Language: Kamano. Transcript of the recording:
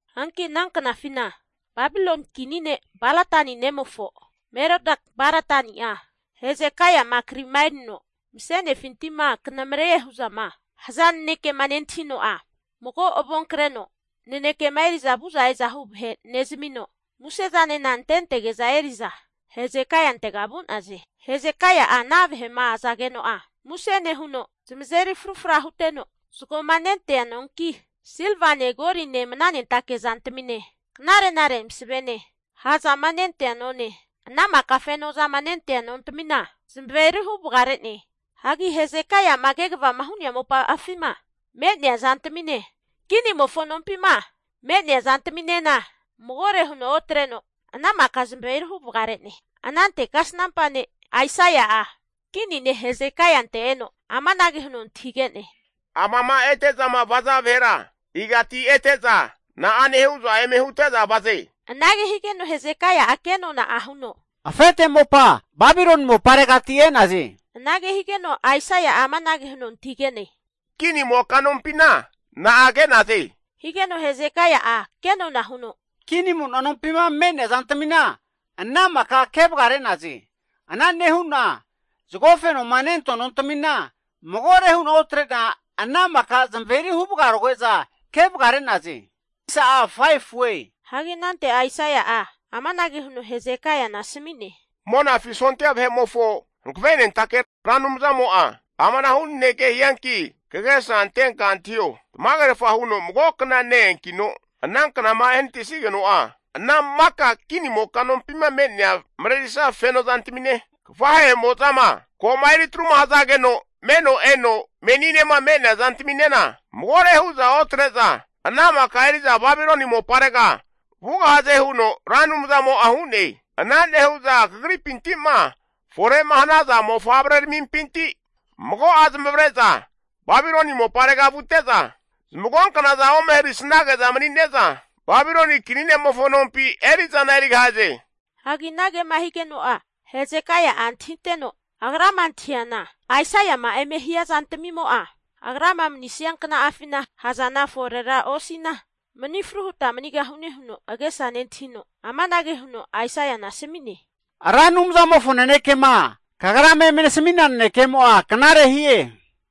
Hanki ana knafina Babiloni kini ne' Baladani nemofo Merodak-Baladani'a Hezekaia'ma krima erino mase'nefinti'ma kanamre'ne hu'zama haza nanekema nentahino'a, mago avonkreno nanekema eri'za vu'za e'za hu vahe nezamino, muse zanena antentege'za eri'za Hesekaiantega vu'naze. Hesekaia'a ana vahe'ma azageno'a, muse nehuno zamazeri frufra huteno zagoma nentea nonki, silvane goline mnanentake zantamine knare'nare masavene ha' zama nentea none, ana maka fenozama nentea nontamina zamaveri huvagare'ne. Hagi Hesekaia'ma kegava hu'nea mopa'afima me'nea zantamine, kinimofo nompima me'nea zantaminena magore huno otreno ana maka zamaveri huvagare'ne. Anante kasnampa ne' Aisaia'a, kini ne' Hesekaiante eno amanage huno antahige'ne, Amama ete'zama vaza vahera igati ete'za, na'ane hu'za eme hute'za vaze. Anage higeno Hesekaia'a kenona'a huno, afete mopa Babiloni moparegati e'naze. Anage higeno Aisaia'a amanage huno antahige'ne, Kinimoka nompina na'a ke'naze? Higeno Hesekaia'a kenona huno, Kinimo'na nompima me'nea zantamina ana maka kevagare'naze. Ana nehu'na zago fenoma nentoa nontamina magore hu'na otre'na ana maka zamaverihu vagaroge'za kevagare'naze. Hagi anante Aisaia'a amanage huno Hesekaiana asami'ne, Monafi sondia vahe'mofo Hankavenentake Ra Anumzamo'a amanahu naneke hianki kagesa antenka antahio, tamagerfa huno mago kna ne-eankino ananknama ehanatisnigeno'a, ana maka kinimoka nompima me'nea marerisa feno zantamine, kafahe'mozama ko'ma eritruma hazageno meno eno meninema me'nea zantaminena magore hu'za otre'za ana maka eri'za Babiloni moparega vugahaze huno Ra Anumzamo'a hu'ne. Ana nehu'za kagripinti'ma fore'ma hanaza mofavrerampinti mago'a zamavare'za Babiloni moparega vute'za, zamagonknaza ome harisnage'za mani'ne'za Babiloni kini ne'mofo nompi eri'zana erigahaze. Hanki anagema higeno'a Hesekaia'a antahiteno, agrama antahiana Aisaia'ma eme hia zantamimo'a, agrama manisnia kna'afina ha' zana forera osina mani fru huta manigahune huno agesa nentahino, amanage huno Aisaiana asami'ne, Ra Anumzamofo nanekema kagrama eme nasamina nanekemo'a knare hie.